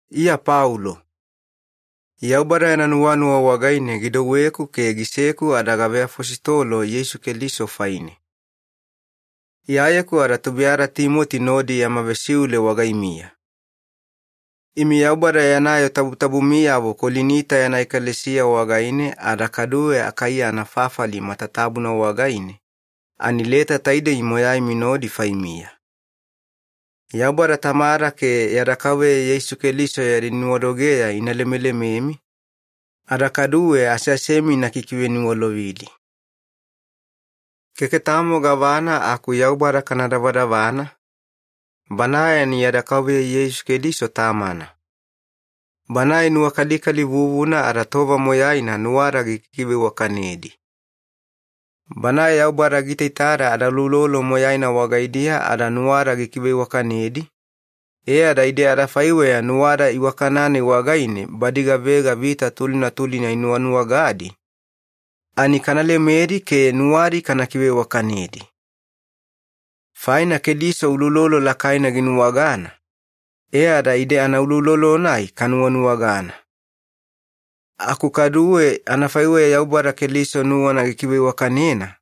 Iya Paulo. Yaubada yana nuwanuwa wagaine gidouweku ke giseku ada gaveafositolo Yeisu Keliso faine. Iyayeku ada tubuiyada Timoti nodi yama vesiule wagaimiya. Imi Yaubada yana yoo tabutabumiyavo Kolinita yana ekalesiya wagaine ada kaduwe Akaiya anafafali matatabuna wagaine, ani leta taidei moyaimi nodi faimiya. Yaubada Tamada ke yada Kauveya Yeisu Keliso yadi nuwadogeya ina lemelememi, ada kaduwe aseasemi ina kikiveniwalovidi. Keke tamo gavana aku Yaubada kana davadavana, Banae ani yada Kauveya Yeisu Keliso Tamana. Banae nuwakalikali vuvuna ada tova moyaina nuwada gikiveiwakanedi. Banae Yaubada giitaitada adauloulolo moyaina wagaidiya ada nuwada gikiveiwakanedi, e ada ide adafaiweya nuwada iwakana-nai wagaine badi gavega vita tulina tulina inuwanuwagadi, ani kana lemedi ke nuwadi kana kiveiwakanedi. Faina Keliso uloulolo lakaina ginuwagana, e ada ide anauloulolo-nai kanuwanuwagana. Aku kaduwe anafaiweya Yaubada Keliso nuwana gikiveiwakanena,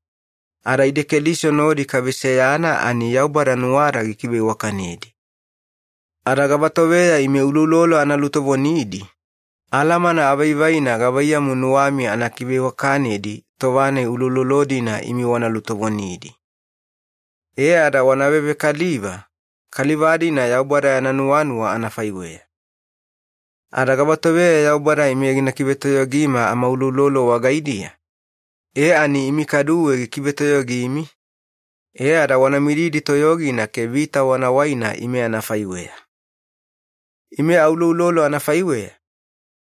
ada ide Keliso nodi kaveseyana ani Yaubada nuwada gikiveiwakanedi. Ada gavatoveya ime uloulolo ana lutovonidi, alamana avaivaina gavaiyamu nuwami ana kiveiwakanedi tova-nai uloulolo-dina imi wana lutovonidi. E ada wana vevekaliva, kaliva-dina Yaubada yana nuwanuwa anafaiweya. Ada gavatoveya Yaubada ime gina kivetoyogima amauloulolo wagaidiya, e ani imi kaduwe gikivetoyogimi, e ada wana mididi toyogina ke vita wana waina ime anafaiweya. Ime auloulolo anafaiweya,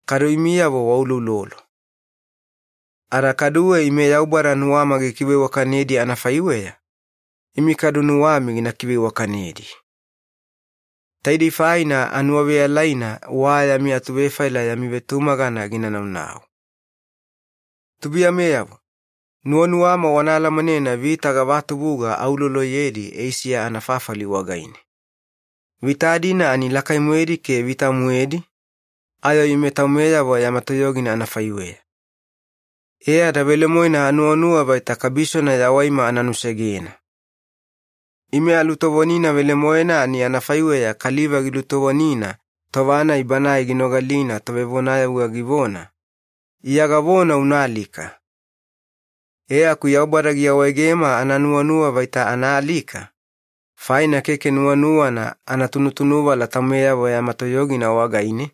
kadu imiyavo wauloulolo. Ada kaduwe ime Yaubada nuwama gikiveiwakanedi anafaiweya, imi kadu nuwami gina kiveiwakanedi. Taidei faina anuwaveyalaina wa yami atuvefaila yami vetumagana gina naunau. Tubuiyameyavo, nuwanuwama wana alamanena vita gavatubuga auloloyedi Eisiya anafafali wagaine. Vita-dina ani lakai-moedi ke vita-moedi, ayo ime taumeyavo yama toyogina anafaiweya. E ada velemoena anuwanuwa vaita kabisona yawaima ana nusegena. Ime alutovonina velemoena ani anafaiweya kaliva gilutovonina tova-nai banae ginogalina tovevonayavuga givona, “Iya gavona una alika.” E aku Yaubada giawaegema ana nuwanuwa vaita ana alika, faina keke nuwanuwana ana tunutunuvala taumeyavo yama toyogina wagaine,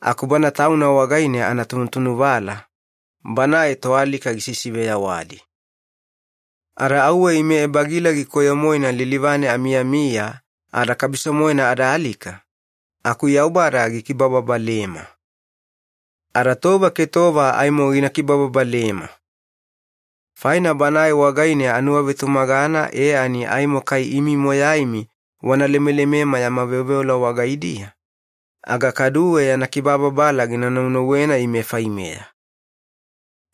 aku Bana Tauna wagaine ana tunutunuvala, Banae toalika gisisiveyawadi. Ada auwe ime ebagilagi koyo-moena lilivane amiyamiya ada kabiso-moena ada alika, aku Yaubada gikibababalema. Ada tova ke tova aimo gina kibababalema. Faina Banae wagaine anuwavetumagana e ani aimo kai imi moyaimi wana lemelemema yami veoveola wagaidiya, aga kaduwe yana kibababala gina naunauwena ime faimeya.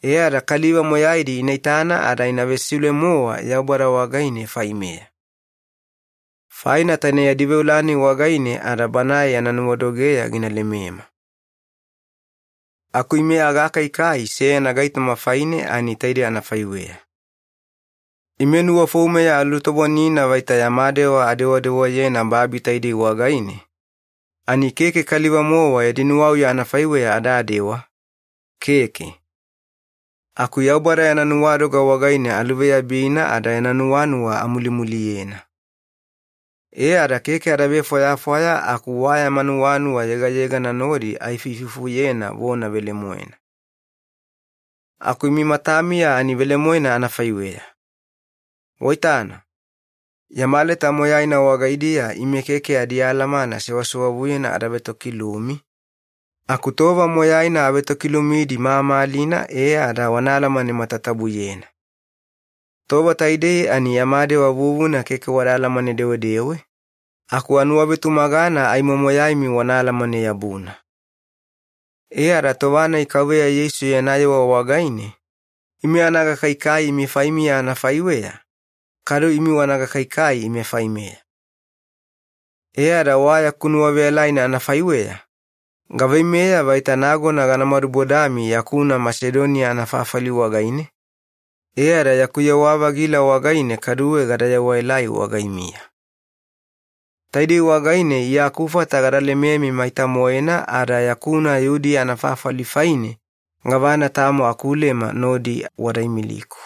E ada kaliva moyaidi ina itana ada ina vesiule-mowa Yaubada wagaine faimeya. Faina taine yadi veola-nai wagaine ada Banae yana nuwadogeya gina lemema. Aku ime agakaikai seyana gaitoma faine ani taide anafaiweya. Ime nuwafoumeya alutovonina vaita yama dewa adewadewayena babi taidei wagaine, ani keke kaliva-mowa yadi nuwauya anafaiweya adadewa, keke. Aku Yaubada yana nuwadoga wagaine aluveyabina ada yana nuwanuwa amulumuliyena. E ada keke ada vefwayafwaya aku wa yama nuwanuwa yegayegana nodi aifuifufuyena vona velemoena. Aku imi matamiya ani velemoena anafaiweya. Waitana, yama leta moyaina wagaidiya ime keke adialamana sewasewavuyena ada vetokilumi, aku tova moyaina avetokilumidi mamalina e ada wana alamane matatabuyena. Tova taidei ani yama dewa vuvuna keke wada alamane-dewedewe, aku anuwavetumagana aimo moyaimi wana alamane-yabuna. E ada tova-nai Kauveya Yeisu yana yewa wagaine, ime ana gakaikai imi faimiya anafaiweya, kadu imi wana gakaikai ime faimeya. E ada wa yaku nuwaveyalaina anafaiweya, gaveimeya vaita nagona gana madubodami yakuna Masedoniya anafafali wagaine, e ada yaku yewa-vagila wagaine kaduwe gada yewaelai wagaimiya. Taidei wagaine Iya akufata gada lememi maita-moena ada yakuna Yudiya anafafali faine gavana tamo akulema nodi wada imiliku.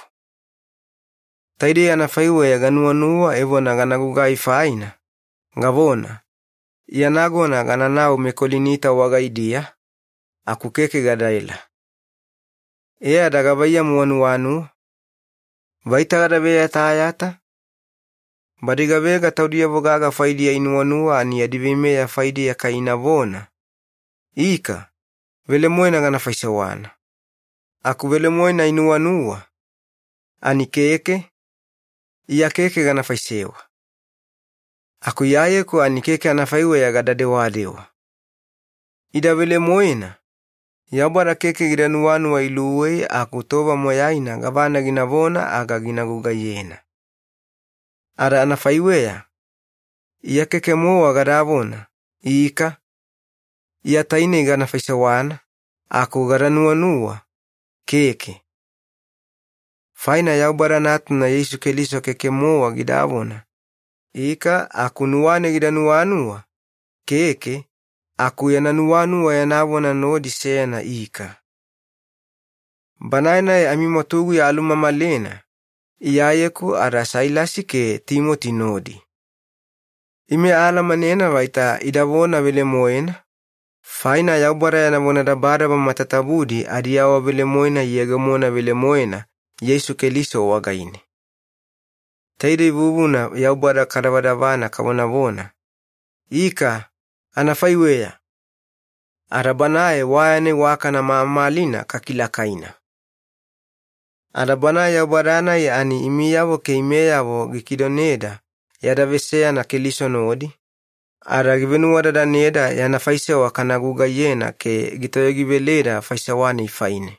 Taidei anafaiweya ganuwanuwa evona gana gugai faina, gavona, “Iya nagona gananau meKolinita wagaidiya,” aku keke gadaela. E ada gavaiyamu wanuwanuwa? Vaita gada veyatayata? Badi gavega taudiyavo gaga faidiya inuwanuwa ani yadi veimeya faidiya kai inavona, “Ika, velemoena gana faisewana,” aku velemoena inuwanuwa, ani “Keke, Iya keke gana faisewa.” Aku Iyayeku ani keke anafaiweya gada dewadewa. Ida velemoena, Yaubada keke gida nuwanuwa iluwei aku tova moyaina gavana ginavona aga gina gugaiyena. Ada anafaiweya, Iya keke-mowa gadavona, “Ika, Iya tainei gana faisewana,” aku gada nuwanuwa, “Keke.” Faina Yaubada Natuna Yeisu Keliso keke-mowa gidavona, “Ika” aku nuwane gida nuwanuwa, “Keke”, aku yana nuwanuwa yana vona nodi seyana “Ika”. Banae-nai amimwatuguya alumamalena, Iyayeku ada Sailasi ke Timoti nodi. Ime aalamanena vaita ida vona velemoena, faina Yaubada yana vonadabadaba matatabudi adiawavelemoena iyegemona velemoena Yeisu Keliso wagaine. Taidei vuvuna Yaubada kadavadavana kavonavona, “Ika, anafaiweya!” ada Banae wa yana iwakana mamalina kakilakaina. Ada Banae Yaubada-nai ani imiyavo ke imeyavo gikidoneda yada veseyana Keliso nodi, ada givenuwadadaneda yana faisewa kana gugaiyena ke gitoyogiveleda faisewa-nai faine.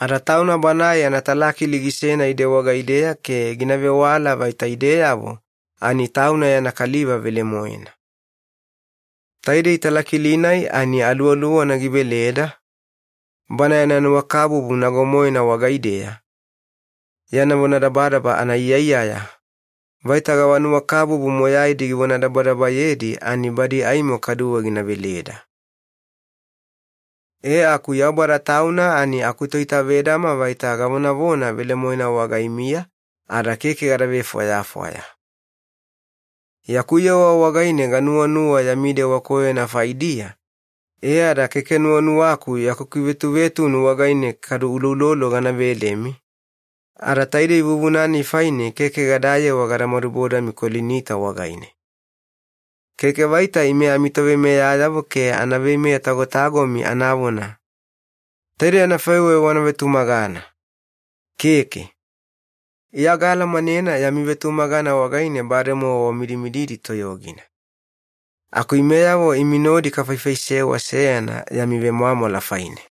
Ada Tauna Banae yana talakili gisena ide wagaideya ke gina vewala vaita ideyavo ani Tauna yana kaliva velemoena. Taidei talakili-nai ani Aluwaluwana giveleda, Bana yana nuwakabubu nago-moena wagaideya, yana vonadabadaba anaiyaiyaya, vaita gava nuwakabubu moyaidi givonadabadabayedi ani badi aimo kaduwe gina veleda. E aku Yaubada Tauna ani akutoitavedama vaita gavonavona velemoena wagaimiya ada keke gada vefwayafwaya. Yaku yewa wagaine ganuwanuwa yami dewa koyona faidiya e ada keke nuwanuwaku yaku kivetuvetunu wagaine kadu uloulolo gana velemi, ada taidei vuvuna-nai faine keke gadayewa gada madubodami Kolinita wagaine. Keke vaita ime amitoveimeyayavo ke ana veimeya-tagotagomi anavona, “Taidei anafaiweya wana vetumagana.” Keke. Iya gaalamanena yami vetumagana wagaine bademowa wamidimididi toyogina. Aku imeyavo imi nodi kafaifaisewa seyana yami vemwamwala faine.